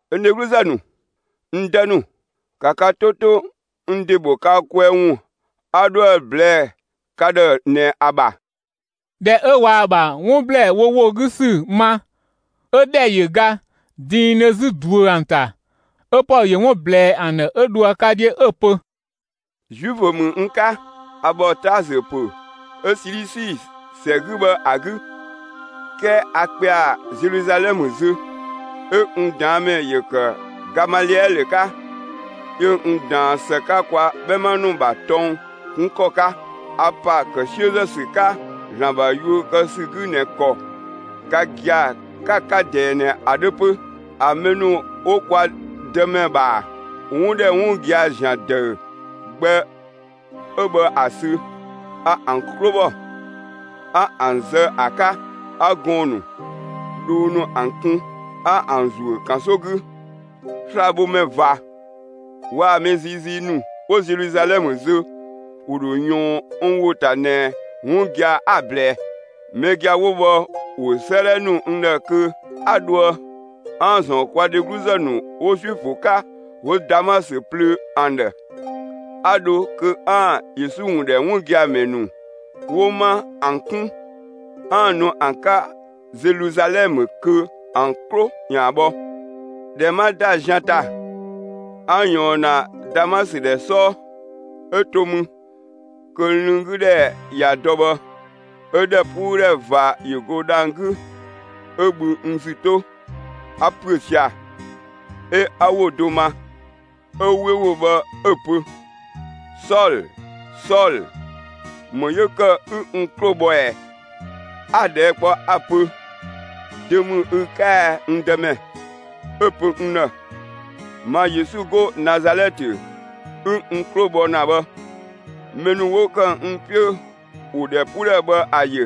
«N dhegluzë ‑nu, n dë ‑nu, ‑ka ka 'to 'to n ‑de ‑bho ka kwɛɛ ‑wun 'a 'dhoë‑ ꞊blɛɛ ka ‑dhë ꞊nɛ ‑a ‑bha!» ꞊Dhɛ 'ö ꞊waa‑ ‑bha 'wun ‑blɛɛ wo ‑wo 'gü ‑sü ma, 'ö ‑dhɛ ‑yö ga diindhö 'zü ꞊duö ‑an ‑ta. 'Ö Pɔlö ‑yö 'wun ꞊blɛɛ ‑an ‑dhë 'ö dho ‑a 'ka 'dhiö 'ö‑ pö: «Zuifö ‑mü n 'ka, a ‑bhɔ Taasö ‑pö 'ö Silisi ‑sɛ 'gü bhë ‑a 'gü, 'kɛɛ 'a ꞊kpɛa Zeluzalɛmë zö. 'Ö n ꞊daanmɛ ‑yö ‑kë Gamaliɛlö 'ka, 'yö n ꞊daan ‑së 'ka kwa 'bhɛma ‑nu ‑bha tɔng 'kun ‑kɔ 'ka. A ‑pa ‑kë 'siözë ‑sü 'ka ‑Zlan ‑bha yuö kë ‑sü 'gü ꞊nɛ ‑kɔ ka gia‑ 'ka‑ 'ka ꞊dɛɛ ꞊nɛ ‑a 'dhö 'pö. A mɛ ‑nu 'wo kwa Dëmɛ ‑bha 'wun ‑dhɛ 'wun gia‑ ‑zian ‑dëü gbɛ 'ö bhë ‑a sü, a ‑an 'klo ‑bhɔ, 'a ‑an zë ‑a 'ka. A gɔɔn‑ ‑nu, dhoo ‑nu ‑an ‑kun, 'a ‑an ‑zuö ‑kanso 'gü. Slabhomɛ ꞊va waa‑ mɛ ziizii ‑nu 'wo Zeluzalɛmë zö, ‑wo ‑dho ꞊yɔɔn n ‑wo ‑ta ꞊nɛ 'wun gia‑ 'a‑ ꞊blɛɛ. Mɛ gia‑ 'wo bhë ‑wo 'sëëdhɛ ‑nu n ‑dhë kö 'a dhoë 'aan‑ ‑zɔn kwa dhegluzë ‑nu 'wo Zuifö 'ka 'wo Damasö plöö ‑an ‑dhë. 'A dho kö 'aan‑ Yesu ‑wun ‑dhɛ 'wun gia‑ ‑mɛ ‑nu 'wo 'ma ‑an 'kun, 'aan‑ nu ‑an 'ka Zeluzalɛmë kö ‑an 'klo ‑yaan bhɔ. ꞊Dhɛ 'ma ‑da zian ‑ta, 'a ꞊yɔɔn ‑na Damasö ‑dhɛ 'sɔɔ, 'ö to mü kö lënng 'gü ‑dhɛ ꞊ya dɔ bhë, 'ö ‑dhɛpuudhɛ ꞊va ‑yö go dhang‑ 'gü, 'ö bhü n ‑zü 'to, 'a ‑püö sia‑, 'ö 'a ‑wo do ma. 'Ö 'we ‑wo bhë 'ö‑ pö: ‹Sɔlö, Sɔlö, ‑më 'yö ‑kë 'ü n 'klo bhɔ ꞊ɛ?› 'A‑ ꞊dhɛɛ' kpɔ 'a‑ pö: ‹Dö ‑mü ü 'ka ɛ, n Dëmɛ?› 'Ö‑ pö n ‑dhë: ‹Ma Yesu 'go Nazalɛtë 'ü n 'klo bhɔ ‑na bhë.› Mɛ ‑nu 'wo ‑kë n 'piö, ‑wo ‑dhɛpuudhɛ bhë ‑a ‑yö,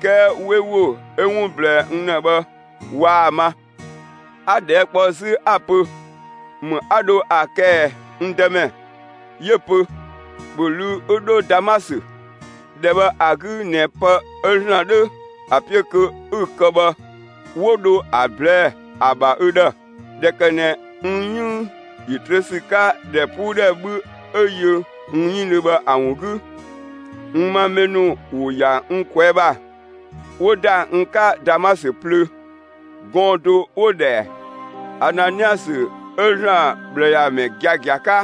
'kɛɛ 'we ‑wo 'ö 'wun ꞊blɛɛ n ‑dhë bhë waa‑ ma. 'A‑ ꞊dhɛɛ' kpɔ 'zü 'a‑ pö: ‹‑Më 'a dho ‑a kë ꞊ɛ, n Dëmɛ?› 'Yö‑ pö: ‹‑Bhö ꞊luu'‑ 'ü 'dho Damasö! ‑Dhɛ bhë ‑a 'gü ꞊nɛ pë 'ö ‑Zlan 'dhö ‑a 'piö kö 'ü‑ kë bhë, 'wo dho ‑a ꞊blɛɛ'‑ ‑a ‑bha ü ‑dhë.› ꞊Dhɛ ‑kë ꞊nɛ n 'yënng ‑yö ‑trö ‑sü 'ka, ‑dhɛpuudhɛ 'bhü 'ö yö n 'yënng bhë ‑a ‑wun 'gü, n ‑ma mɛ ‑nu ‑wo ‑ya n ꞊kwɛɛ' ‑bha, 'wo ‑da n 'ka Damasö plöö. Gɔɔn‑ do 'wo‑ ‑dhɛ Ananiasö 'ö ‑Zlan ꞊bhlëyamɛ giagia 'ka,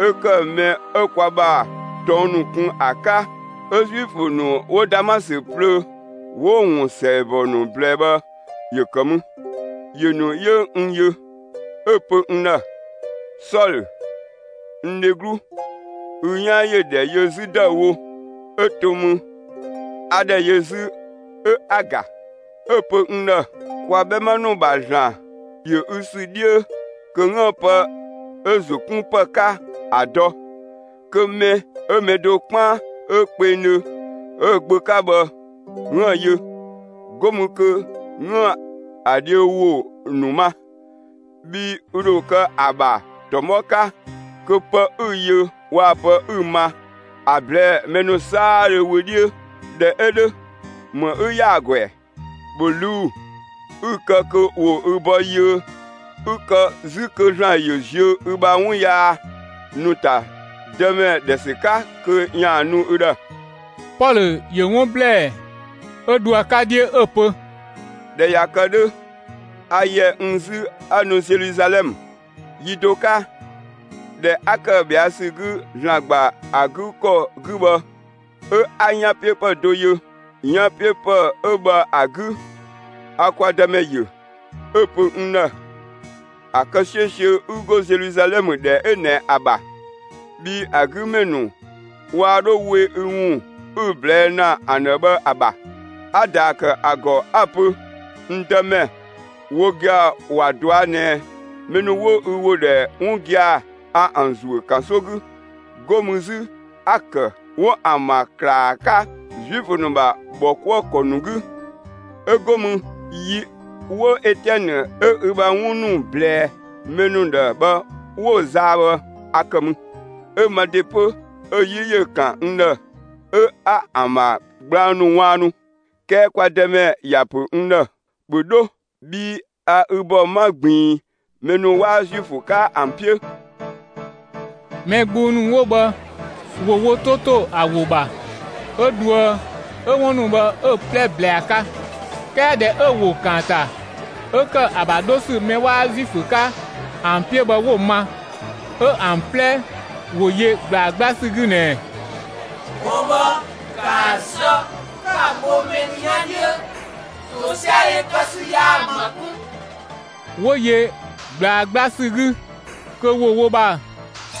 'ö ‑kë mɛ 'ö kwa ‑bha tɔng ‑nu kun ‑a 'ka, 'ö Zuifö ‑nu 'wo Damasö plöö 'wo‑ ‑wun ‑sɛɛbɔ ‑nu ꞊blɛɛ bhë ‑yö ‑kë mü. ‑Yö ‑nu 'yö n yö, 'ö‑ pö n ‑dhë: ‹Sɔlö, n dheglu, ü 'yan ‑yö ‑dhɛ yö 'zü ‑dëüwo!› 'Ö to mü, 'a ‑dhɛ yö 'zü 'ö 'a‑ ‑ga. 'Ö‑ pö n ‑dhë: ‹Kwa 'bhɛma ‑nu ‑bha ‑Zlan ‑yö ü ‑sü 'dhiö kö 'üën‑ pë 'ö‑ ‑zo 'kun ‑pë 'ka ‑a dɔ kö mɛ 'ö mɛ do 'kpaan 'ö kpengdhö 'ö‑ Gbö 'ka bhë 'üën‑ yö, 'go mü kö 'üën‑ ‑a dhiö ‑wo ‑nu ma. Bhii ü ‑dho kë ‑a ‑bha ‑tɔmɔ 'ka, kö pë 'ü‑ yö ‑waa pë 'ü‑ ma, ‑a ꞊blɛɛ'‑ mɛ ‑nu 'saadhö wö 'dhiö. ꞊Dhɛ 'ö 'dhö, ‑më 'ü ‑ya ‑a ‑gɔ ‑ɛ? ‑Bhö ꞊luu'‑, 'ü‑ kë kö ‑wo ü ‑bɔ yiö, 'ü‑ kë 'zü kö ‑Zlan ‑yö ziö ü ‑bha 'wun yaa ‑nu ‑ta Dëmɛ ‑dhɛ ‑sü 'ka kö ‑yaan nu ü ‑dhë.›» Pɔlö ‑yö 'wun ‑blɛɛ 'ö dho ‑a 'ka 'dhiö 'ö‑ pö: «꞊Dhɛ ꞊ya kë 'dhö, a ‑yɛ n 'zü 'a nu Zeluzalɛmë. Yi do 'ka, ꞊dhɛ 'a ‑kë ꞊bhɛa' ‑sü 'gü ‑Zlan ‑gba ‑a 'gü ‑kɔ 'gü bhë, 'ö 'a 'yanpiöpë do ‑yö. 'Yanpiöpë 'ö bhë ‑a 'gü, a kwa Dëmɛ ‑yö, 'ö‑ pö n ‑dhë: ‹‑A kë 'siösiö 'ü 'go Zeluzalɛmë ‑dhɛ 'ö ꞊nɛ ‑a ‑bha! Bhii ‑a 'gü ‑mɛ ‑nu waa 'dho we n ‑wun 'ü‑ ꞊blɛɛ' ‑na ‑an ‑dhë bhë ‑a ‑bha.› 'A‑ ‑daa ‑kë ‑a ‑gɔ 'a‑ pö: ‹N Dëmɛ, wo gia‑ ‑wa ꞊dɔa' ꞊nɛ, mɛ ‑nu 'wo ü ‑wo ‑dhɛ 'wun gia‑, a ‑an ‑zuö ‑kanso 'gü. 'Go mü 'zü 'a‑ ‑kë 'wo ‑an ‑ma ‑klaa 'ka Zuifö ‑nu ‑bha ‑bhɔkuëkɔ ‑nu 'gü. 'Ö go mü, yi 'wo Etiɛnë 'ö ü ‑bha 'wun ‑nu ꞊blɛɛ mɛ ‑nu ‑dhë bhë 'wo‑ zaa bhë, a ‑kë mü, 'ö ma ‑de 'pö 'ö‑ 'yi ‑yö ‑kan n ‑dhë 'ö 'a ‑an ‑bha gblang ‑nu ꞊waannu.› 'Kɛɛ kwa Dëmɛ ‑ya ‑pö n ‑dhë: ‹‑Bhö 'dho, bhii a ü ‑bɔ 'ma ꞊gbiin mɛ ‑nu 'waa Zuifö 'ka ‑an 'piö!›» Mɛ gbung ‑nu 'wo bhë ‑wo wo 'to ‑to ‑a ‑wo ‑bha 'ö dhoë 'ö 'wun ‑nu bhë 'ö‑ 'plɛ ꞊blɛɛ ‑a 'ka. 'Kɛɛ ꞊dhɛ 'ö‑ ‑wo ‑kaanta 'ö ‑kë ‑a ‑bha 'dho ‑sü mɛ 'waa Zuifö 'ka ‑an 'piö bhë 'wo‑ ma, 'ö ‑an 'plɛ ‑wo yö ꞊gblaa 'gbla ‑sü 'gü ꞊nɛɛ: «Gɔɔn‑ bhë, ‑kaa zë, 'ka‑ bho mɛ ‑nu 'yan 'dhiö! ‑Tosiadhe kë ‑sü yaa‑ ‑ma 'kun!» 'Wo yö ꞊gblaa 'gbla ‑sü 'gü kö ‑wo wo ‑bha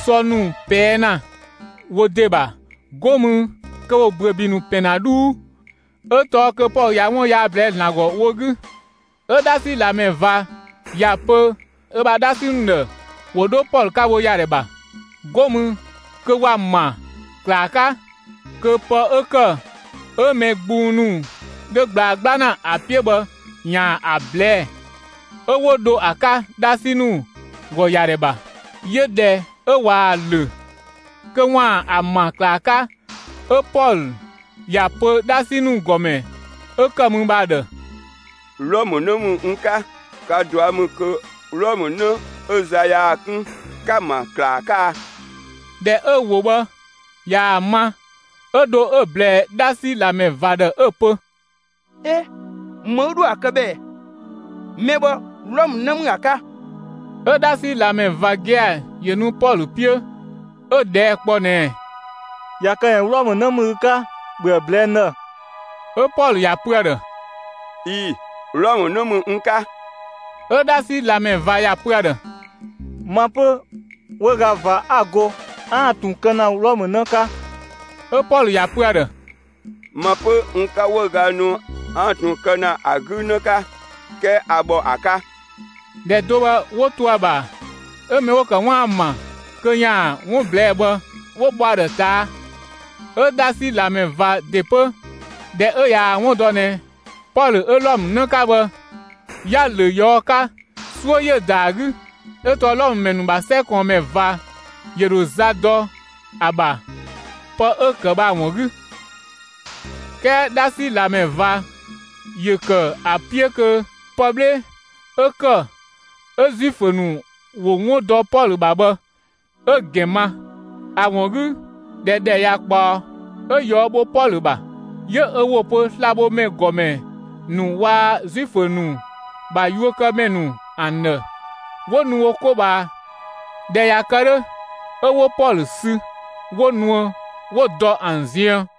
sɔ ‑nu ꞊pɛɛ' ‑na wo ‑de ‑bha, 'go mü kö ‑wo ‑büöbi ‑nu ‑pɛn ‑na 'dhuu, 'ö tɔɔ kö Pɔlö ꞊ya 'wun yaa ꞊blɛɛ'‑ ‑Zlan ‑gɔ wo 'gü. 'Ö 'dhasi ꞊lamɛ ꞊va ‑ya pö ö ‑bha 'dhasi ‑nu ‑dhë ‑wo 'dho Pɔlö 'ka wo ‑yadhɛ ‑bha, 'go mü kö ‑wa ‑ma ‑klaa 'ka kö pë 'ö ‑kë 'ö mɛ gbung ‑nu 'dhö ꞊gblaa 'gbla ‑na ‑a 'piö bhë ‑yaan ‑a ꞊blɛɛ'‑. 'Ö 'wo dho ‑a 'ka 'dhasi ‑nu ‑gɔ ‑yadhɛ ‑bha. 'Yö ꞊dhɛ 'ö ꞊waa‑ ‑lö kö ‑waan ‑a ‑ma ‑klaa 'ka, 'ö Pɔlö ‑ya pö 'dhasi ‑nu ‑gɔmɛ 'ö ‑kë mü bhë ‑a ‑dhë: «Wlɔmë 'në ‑mü n 'ka; ka ꞊dua' ‑mü kö Wlɔmë 'në 'ö za 'yaa‑ 'kun, 'ka‑ ‑ma ‑klaa 'ka a?» ꞊Dhɛ 'ö‑ ‑wo bhë ꞊yaa‑ ma, 'ö dho 'ö‑ ꞊blɛɛ 'dhasi ꞊lamɛ ꞊va ‑dhë 'ö‑ pö: «'E, ‑më 'ü 'dhoë‑ ‑a kë bhë ꞊ɛ? Mɛ bhë Wlɔmë 'në ‑mü ‑a 'ka!» 'Ö 'dhasi ꞊lamɛ ꞊va gia‑ ‑yö nu Pɔlö 'piö, 'ö‑ ꞊dhɛɛ' kpɔ ꞊nɛɛ: «꞊Ya kë ꞊nɛ Wlɔmë 'në ‑mü ü 'ka, ‑bhö ‑a ꞊blɛɛ'‑ n ‑dhë!» 'Ö Pɔlö ‑ya pö ‑a ‑dhë: «꞊Ii‑, Wlɔmë 'në ‑mü n 'ka.» 'Ö 'dhasi ꞊lamɛ ꞊va ‑ya pö ‑a ‑dhë: «Ma 'pö 'wëüga ꞊va 'a‑ go 'aan‑ ꞊tun kë ‑na Wlɔmë 'në 'ka.» 'Ö Pɔlö ‑ya pö ‑a ‑dhë: «Ma 'pö, n 'ka 'wëüga nu 'aan‑ ꞊tun kë ‑na ‑a 'gü 'në 'ka, 'kɛɛ 'a ‑bhɔ ‑a 'ka.» ꞊Dhɛ do bhë 'wo to ‑a ‑bha 'ö mɛ 'wo‑ ‑kë 'waan‑ ‑a ‑ma kö ‑yaan 'wun ꞊blɛɛ'‑ bhë, 'wo bhɔ ‑a ‑dhë ꞊taa'. 'Ö 'dhasi ꞊lamɛ ꞊va ‑de 'pö, ꞊dhɛ 'ö ꞊yaa‑ 'wun dɔ ꞊nɛ Pɔlö 'ö Wlɔmë 'në 'ka bhë, 'ya‑ ‑lö ꞊yɔɔ' 'ka, 'suö ‑yö ‑da ‑a 'gü, 'ö tɔɔ Wlɔmë ‑mɛ ‑nu ‑bha 'sɛ ꞊kɔɔnmɛ ꞊va ‑yö ‑dho za dɔ ‑a ‑bha pë 'ö‑ ‑kë bhë ‑a ‑wun 'gü. 'Kɛɛ 'dhasi ꞊lamɛ ꞊va ‑yö ‑kë ‑a 'piö kö pë 'bhle 'ö ‑kë 'ö Zuifö ‑nu ‑wo 'wun dɔ Pɔlö ‑bha bhë 'ö‑ ‑gɛn ma. ‑A ‑wun 'gü, ꞊dhɛ ‑dhɛ ꞊ya ꞊kpaɔ, 'ö ꞊yɔɔ' bho Pɔlö ‑bha, 'yö ö ‑wo pö slabhomɛ ‑gɔmɛ ‑nu waa‑ Zuifö ‑nu ‑bha ‑yakuëkëmɛ ‑nu ‑an ‑dhë 'wo nu wo 'ko ꞊bhaa. ꞊Dhɛ ꞊ya kë 'dhö, 'ö 'wo Pɔlö sü 'wo nuë 'wo‑ dɔ ‑an ziën.